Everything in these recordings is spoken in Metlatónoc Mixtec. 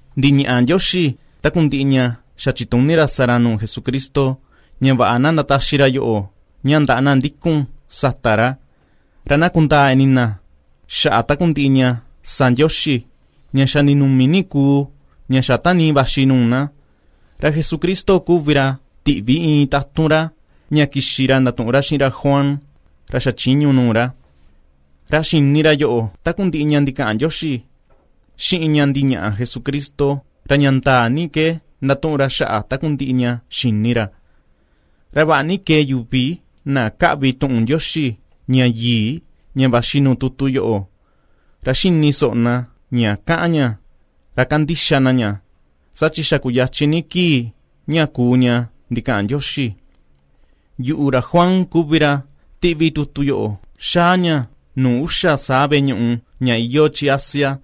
Ndiñaꞌa Ndioxi takundiꞌi ña xa chituni ra sa ra nuu Jesucristo ña vaꞌa na ndataxi ra yoꞌo ña ndaꞌa na ndikun sata ra, ra na kundaa ini na xaꞌa takundiꞌi ña sa Ndioxi, ña xa ninumi ni kuu, ña xa tanii vaxi nuu na. Ra Jesucristo kuvi ra tiꞌvi iin tatun ra ña kixi ra ndatuꞌun ra xiꞌin ra Juan, ra xa chiñu nuu ra. Ra xini ra yoꞌo takundiꞌi ña ndikaꞌan Ndioxi, xiꞌin ña ndiñaꞌa Jesucristo, ra ña ndaa ni ke ndatuꞌun ra xaꞌa takundiꞌi ña xini ra. Ra vaꞌa ni kee yuvi na ^kaꞌvi tuꞌun Ndioxi, ña yii, ña vaxi nuu tutu yoꞌo, ra ^xini soꞌo na ña kaꞌan ña, ra kandixa na ña, saa chi xa kuyachin ni kii ña kuu ña ndikaꞌan Ndioxi. Yuꞌu, ra Juan, kuvi ra tiꞌvi tutu yoꞌo xáá ña nuu uxa veꞌe ñuꞌu ña iyoo chi Asia: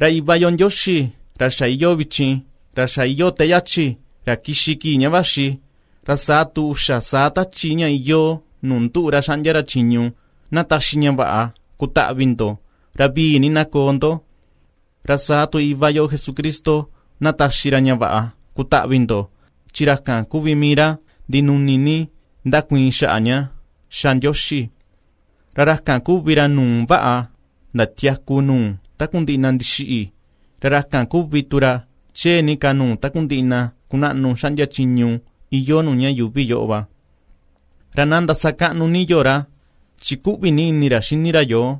Ra Iva yo Ndioxi ra iyoo vichin, ra xa iyoo te yachi, ra kixi kii ña vaxi, ra saa tu uxa saa Tachi ña iyoo nuu nduꞌu ra xaꞌndia ra chiñu, na taxi ña vaꞌa kutaꞌvi ndo, ra vii ni na koo ndo. Ra saa tu Iva yo Jesucristo na taxi ra ña vaꞌa kutaꞌvi ndo chi ra kan kuvi mii ra ndinuni ni ^ndakuiin xaꞌa ña ^xa Ndioxi, ra ra kan kuvi ra nuu vaꞌa ndatiaku nuu takundiꞌi na ndixiꞌi, ra ra kan kuvi tu ra chee ni ka nuu takundiꞌi na kunaꞌnu xaꞌndia chiñu iyoo nuu ña yuvi yoꞌo va. Ra na ndasakaꞌnu ni yo ra chi ^kuꞌvi ni ini ra xini ra yoo,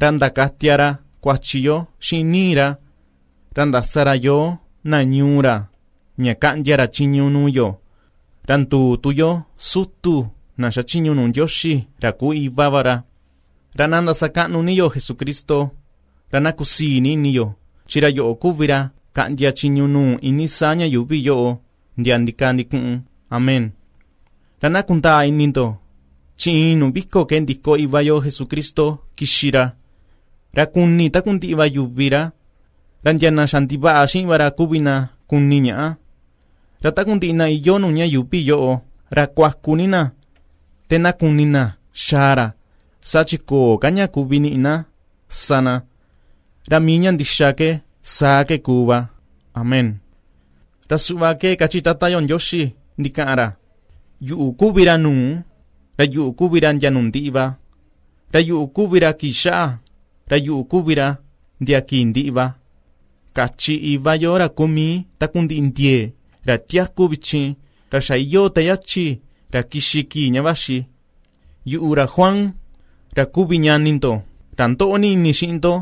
ra ndakatia ra kuachi yo xiꞌin ni̱i̱ ra, ra ndasa ra yoo, na ñuu ra ña kaꞌndia ra chiñu nuu yo, ra nduu tu yo sutu na xachiñu nuu Ndioxi, ra kuu Iva va ra. ¡Ra na ndasakaꞌnu ni yo Jesucristo, ra na kusii ni ini yo chi ra yoꞌo kuvi ra kaꞌndia chiñu nuu iinii saa ña yuuvi yoꞌo ndia ndikaa ndikuꞌun! Amén. Ra na kundaa ini ndo, chi iin nuu viko ke ndiko Iva yo Jesucristo kixi ra, ra kuni takundiꞌi va yuvi ra, ra ndia na xandivaꞌa xiꞌin va ra kuvi na kuni ñaꞌa, ra takundiꞌi na iyoo nuu ña yuuvi yoꞌo, ra kuaku ni na, te na kuni na xaa ra, saa chi köo ka ña kuvi niꞌi na sa na. Ra mii ña ndixa ke, saa ke kuu va. Amén. Ra suꞌva kachi Tata yo Ndioxi ndikaꞌan ra: “Yuꞌu kuvi ra nuu, ra yuꞌu kuvi ra ndia nuu ndiꞌi va; ra yuꞌu kuvi ra kii xaꞌa, ra yuꞌu kuvi ra ndia kii ndiꞌi va”, kachi Iva yo ra kuu mii takundiꞌi ndiee, ra tiaku vichin, ra xa iyoo te yachi, ra kixi kii ña vaxi. Yuꞌu, ra Juan, ra kuvi ñani ndo, ra ^ndoꞌo ini xiꞌin ndo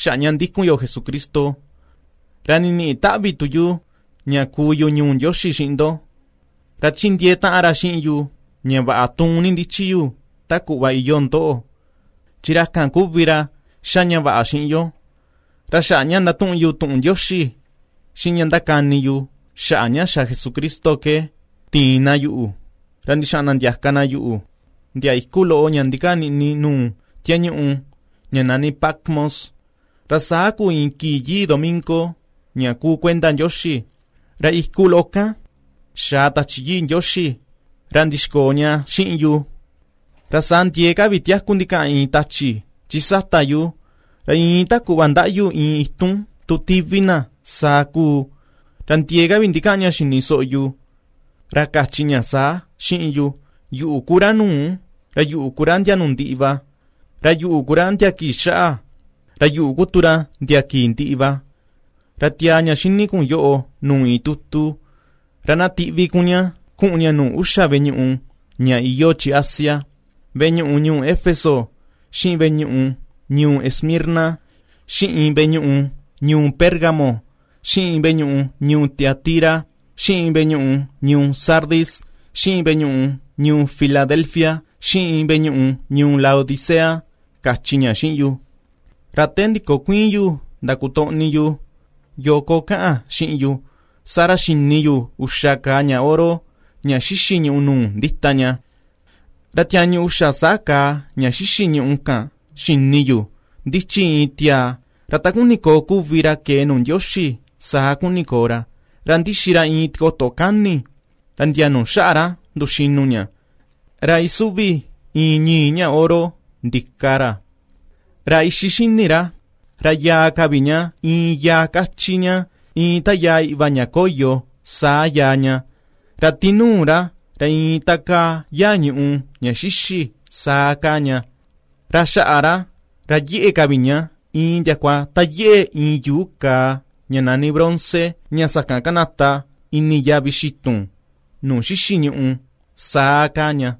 xaꞌa ña ndikun yo Jesucristo; ra niniꞌi taꞌvi tu yu ña kuu yu ñuu Ndioxi xiꞌin ndo, ra ^chindiee taꞌan ra xiꞌin yu ña vaꞌa tuun ni ndichi yu ta kuꞌva iyoo ndoꞌo. Chi ra kan kuvi ra ^xa ña vaꞌa xiꞌin yo. Ra xaꞌa ña ndatuꞌun yu tuꞌun Ndioxi, xiꞌin ña ndakani yu xaꞌa ña xa Jesucristo ke tiin na yuꞌu ra ndixaꞌan na ndiaka na yuꞌu, ndia iku loꞌo ña ndikaa niꞌni nuu tiañuꞌu ña nani Patmos. Ra saa kuu iin kii yii domingo, ña kuu kuenda Ndioxi, ra iku loꞌo kan, xaa Tachi Yii Ndioxi ra ndixkoo ña xiꞌin yu, ra saa ndiee ka vi tiaku ndikaꞌan iin tachi chi sata yu, ra iin ta kuꞌva ndaꞌyu iin itun tu tivi na, saa kuu, ra ndiee ka vi ndikaꞌan ña xini soꞌo yu, ra kachi ña saa xiꞌin yu: ―Yuꞌu ku ra nuu, ra yuꞌu ku ra ndia nuu ndiꞌi va, ra yuꞌu ku ra ndia kii xaꞌa, ra yuꞌu ku tu ra ndia kii ndiꞌi va. Ra tiaa ña ^xíní kun yoꞌo nuu iin tutu, ra na tiꞌvi kun ña kuꞌun ña nuu uxa veꞌe ñuꞌu ña iyoo chi Asia: veꞌe ñuꞌu ñuu Éfeso, xiꞌin veꞌe ñuꞌu ñuu Esmirna, xiꞌin veꞌe ñuꞌu ñuu Pérgamo, xiꞌin veꞌe ñuꞌu ñuu Tiatira, xiꞌin veꞌe ñuꞌu ñuu Sardis, xiꞌin veꞌe ñuꞌu ñuu Filadelfia, xiꞌin veꞌe ñuꞌu ñuu Laodicea ―kachi ña xiꞌin yu. Ra te ndikokuiin yu ndakotoꞌni yu, yoo ko kaꞌan xiꞌin yu, saa ra xini yu uxa kaa ña oro ña xixi ñùꞌù ndita ña, ra tiañu uxa saa kaa ña xixi ñùꞌù kan, xini yu ndichi iin tiaa, ra ta kuni koo kuvi ra kee nuu Ndioxi saa kuni koo ra, ra ndixi ra iin tikoto kani, ra ndia nuu xaꞌa ra nduxinu ña, ra isuvi iin ñi̱i̱ ña oro ndika ra. Ra ixi xini ra, ra yaa ka vi ña, iin yaa káchí ña, iin ta yaa iꞌva ña koyo, saa yaa ña; ra tinuu ra, ra iin ta kaa yaa ñùꞌù, ña xíxî, saa kaa ña. Ra xaꞌa ra, ra yeꞌe ka vi ña iin ndiakua ta yeꞌe iin yuu kaa ña nani bronce, ña sakan kanata ini yavi xitun, nuu xixi ñuꞌu, saa kaa ña,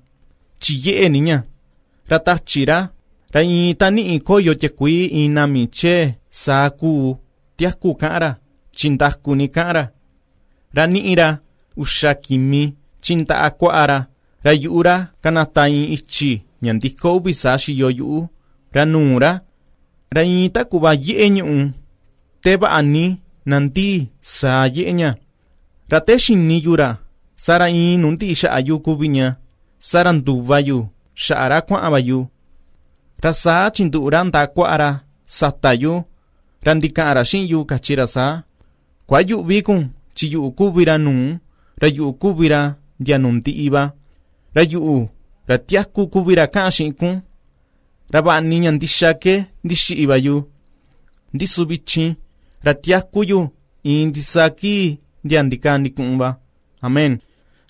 chi yeꞌe ni ña; ra tachi ra, ra iin ta niꞌi koyo tiakuii iin nami chee, saa kuu tiaku kaꞌan ra, chi ndaku ni kaꞌan ra. Ra ^niꞌi ra uxa kimi chi ndaꞌa kuaꞌa ra; ra yuꞌu ra, ^kanata iin i̱chi̱ ña ndiko uvi saa xiyo yuꞌu, ra nuu ra, ra iin ta kuꞌva yeꞌe ñuꞌù te vaꞌa ni nandii, saa yeꞌe ña. Ra te xini yu ra, saa ra iin nuu ndiꞌi xaꞌa yu kuvi ña, saa ra nduva yu xaꞌa ra kuaꞌan va yu; ra saa chinduꞌu ra ndaꞌa kuaꞌa ra sata yu, ra ndikaꞌan ra xiꞌin yu kachi ra saa: ―Kuayüꞌvi kun chi yuꞌu kuvi ra nuu, ra yuꞌu kuvi ra ndia nuu ndiꞌi va, ra yuꞌu, ra tiaku kuvi ra kaꞌan xiꞌin kun; ra vaꞌa ni ña ndixa ke ndixiꞌi va yu, ndi su vichin ra tiaku yu iin ndisaa kii ndia ndikaa ndikuꞌun va, amén.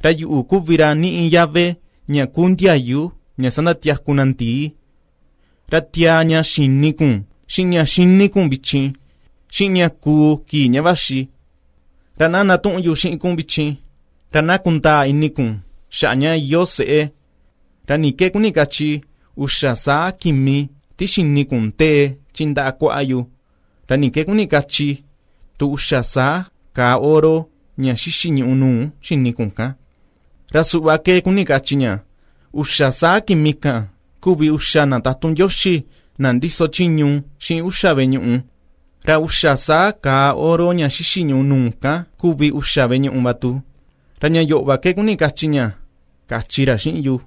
Ra yuꞌu kuvi ra niꞌi yave ña ku ndiayu ña sandatiaku na ndii. Ra tiaa ña xa xini kun, xiꞌin ña ^xíní kun vichin, xiꞌin ña kuu kii ña vaxi. Ra na ndatuꞌun yu xiꞌin kun vichin, ra na kundaa ini kun xaꞌa ña iyoo se̱ꞌè, ra ni ke kuni kachi uxa saa kimi ti xini kun ndee chi ndaꞌa kuaꞌa yu, ra ni ke kuni kachi tu uxa saa kaa oro ña xixi ñùꞌù nuu xini kun kan: Ra suꞌva ke kuni kachi ña: Uxa saa kimi kan kuvi uxa na tatun Ndioxi na ndiso chiñu xiꞌin uxa veꞌe ñuꞌu, ra uxa saa kaa oro ña xixi ñuꞌu nuu kan kuvi uxa veꞌe ñuꞌu va tu; ra ña yoꞌo va ke kuni kachi ña ―kachi ra xiꞌin yu.